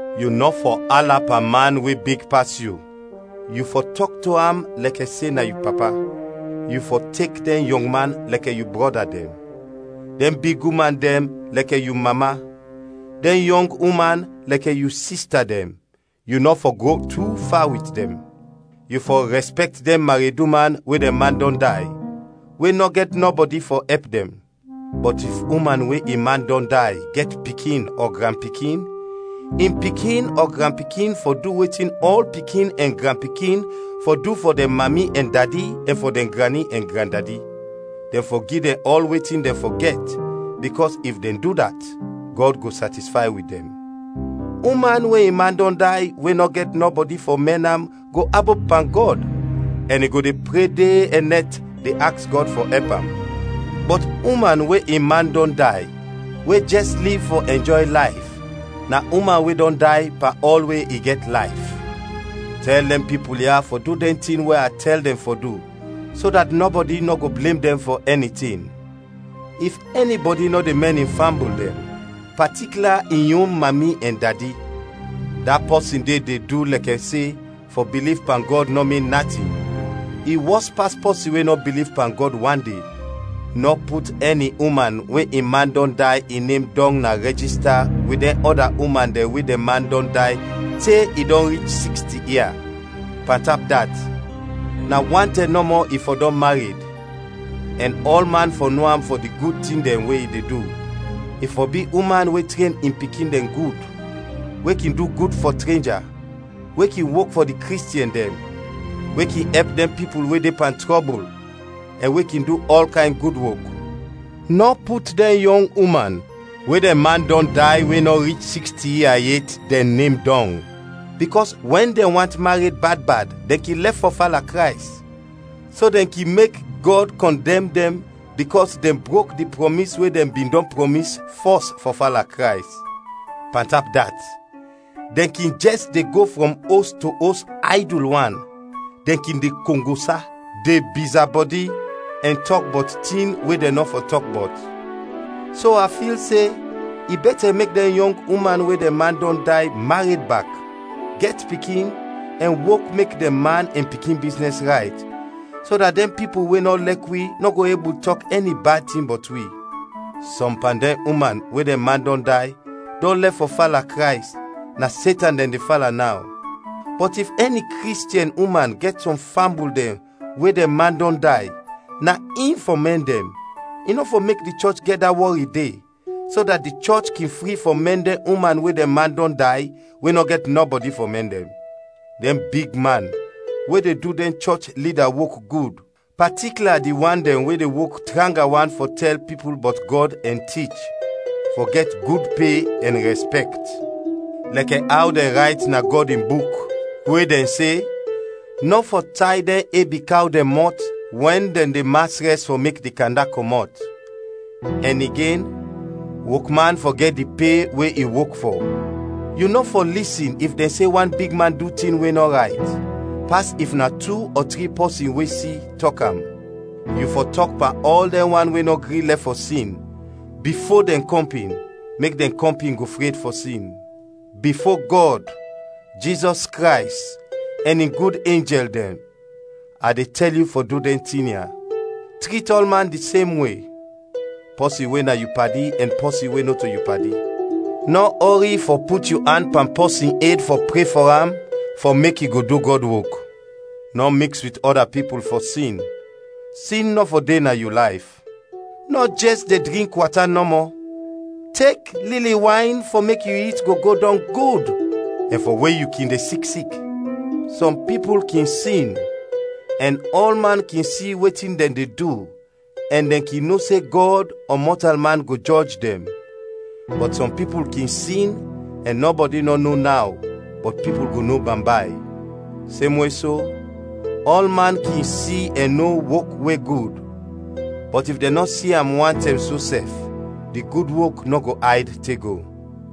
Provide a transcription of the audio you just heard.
Yu nɔ fɔ ala pan man we big pas yu, yu fɔ tɔk to am lɛkɛ se na yu papa. Yu fɔ tek dɛn yɔngman lɛkɛ yu brɔda dɛn; dɛn big uman dɛn lɛkɛ yu mama; dɛn yɔng uman lɛkɛ yu sista dɛn, yu nɔ fɔ go tu fa wit dɛn. Yu fɔ rɛspɛkt dɛn mareduman we dɛn man dɔn day, we nɔ gɛt nɔbɔdi fɔ ɛp dɛn. Bɔt if uman we in man dɔn day gɛt pikin ɔ granpikin, in pikin ɔ granpikin fɔ du wetin ɔl pikin ɛn granpikin fɔ du fɔ dɛn mami ɛn dadi ɛn fɔ dɛn grani ɛn grandadi dɛn fɔ gi dɛn ɔl wetin dɛn fɔ gɛt, bikɔs if dɛn du dat, Gɔd go satisfay wit dɛn. Uman we in man dɔn day we nɔ gɛt nɔbɔdi fɔ mɛn am go abop pan Gɔd ɛn i go de pre de ɛn nɛt de aks Gɔd fɔ ɛp am. Bɔt uman we in man dɔn day we jɛs liv fɔ ɛnjɔy layf, na uman we dɔn day pan ɔl we i gɛt layf. Tɛl dɛn pipul ya fɔ du dɛn tin we a tɛl dɛn fɔ du, so dat nɔbɔdi nɔ go blem dɛn fɔ ɛni tin. If ɛnibɔdi nɔ de mɛn in fambul dɛn, patikla in yon mami ɛn dadi, da pɔsin de de du lɛkɛ se fɔ biliv pan Gɔd nɔ min natin, i wɔs pas pɔsin we nɔ biliv pan Gɔd wan de. Nɔ put ɛni uman we in man dɔn day in nem dɔng na rɛjista wit dɛn ɔda uman dɛn we dɛn man dɔn day te i dɔn rich siksti ia. Pantap dat, na wan tɛm nɔmɔ i fɔ dɔn mared, ɛn ɔlman fɔ no am fɔ di gud tin dɛn we i de du: i fɔ bi uman we tren in pikin dɛn gud, we kin du gud fɔ trenja, we kin wok fɔ di Kristiɛn dɛn, we kin ɛp dɛn pipul we de pan trɔbul, ɛn we kin du ɔl kayn gud wok. Nɔ put dɛn yɔng uman we dɛn man dɔn day we nɔ rich siksti ia yet dɛn nem dɔng, bikɔs wɛn dɛn want mared bad bad, dɛn kin lɛf fɔ fala Krays, so dɛn kin mek Gɔd kɔndɛm dɛn bikɔs dɛn brok di prɔmis we dɛn bin dɔn prɔmis fɔs fɔ fala Krays. Pantap dat, dɛn kin jɛs de go frɔm os to os aydul wan, dɛn kin de kongosa, de bizabɔdi, ɛn tɔk bɔt tin we dɛn nɔ fɔ tɔk bɔt. So a fil se i bɛtɛ mek dɛn yɔng uman we dɛn man dɔn day mared bak, gɛt pikin ɛn wok mek dɛn man ɛn pikin biznɛs rayt, so dat dɛn pipul we nɔ lɛk wi nɔ go ebul tɔk ɛni bad tin bɔt wi. Sɔm pan dɛn uman we dɛn man dɔn day dɔn lɛf fɔ fala Krays, na Setan dɛn de fala naw. Bɔt if ɛni Kristiɛn uman gɛt sɔm fambul dɛn we dɛn man dɔn day, na in fɔ mɛn dɛn, i nɔ fɔ mek di chɔch gɛt da wɔri de, so dat di chɔch kin fri fɔ mɛn dɛn uman we dɛn man dɔn day, we nɔ gɛt nɔbɔdi fɔ mɛn dɛn. Dɛn bigman we de du dɛn chɔch lida wok gud, patikla di wan dɛn we de wok tranga wan fɔ tɛl pipul bɔt Gɔd ɛn tich, fɔ gɛt gud pe ɛn rɛspɛkt. Lɛkɛ aw dɛn rayt na Gɔd in Buk, we dɛn se, “Nɔ fɔ tay dɛn ebi kaw dɛn mɔt wɛn dɛn de mas rɛs fɔ mek di kanda kɔmɔt” ɛn igen “Wokman fɔ gɛt di pe we i wok fɔ”. Yu nɔ fɔ lisin if dɛn se wan bigman du tin we nɔ rayt, pas if na tu ɔ tri pɔsin we si, tɔk am. Yu fɔ tɔk pan ɔl dɛn wan we nɔ gri lɛf fɔ sin, bifo dɛn kɔmpin, mek dɛn kɔmpin go fred fɔ sin. Bifo Gɔd, Jizɔs Krays, ɛn in gud enjɛl dɛn, a de tɛl yu fɔ du dɛn tin ya; trit ɔlman di sem we, pɔsin we na yu padi ɛn pɔsin we nɔto yu padi. Nɔ ɔri fɔ put yu an pan pɔsin ed fɔ pre fɔ am fɔ mek i go du Gɔd wok. Nɔ miks wit ɔda pipul fɔ sin; sin nɔ fɔ de na yu layf. Nɔ jɛs de drink wata nɔmɔ, tek lili wayn fɔ mek yu it go go dɔng gud ɛn fɔ we yu kin de sik sik. Sɔm pipul kin sin ɛn ɔlman kin si wetin dɛn de du ɛn dɛn kin no se Gɔd ɔ mɔtalman go jɔj dɛn, bɔt sɔm pipul kin sin ɛn nɔbɔdi nɔ no naw, bɔt pipul go no bambay. Semwe so, ɔlman kin si ɛn no wok we gud, bɔt if dɛn nɔ si am wantɛm so sɛf, di gud wok nɔ go ayd te go.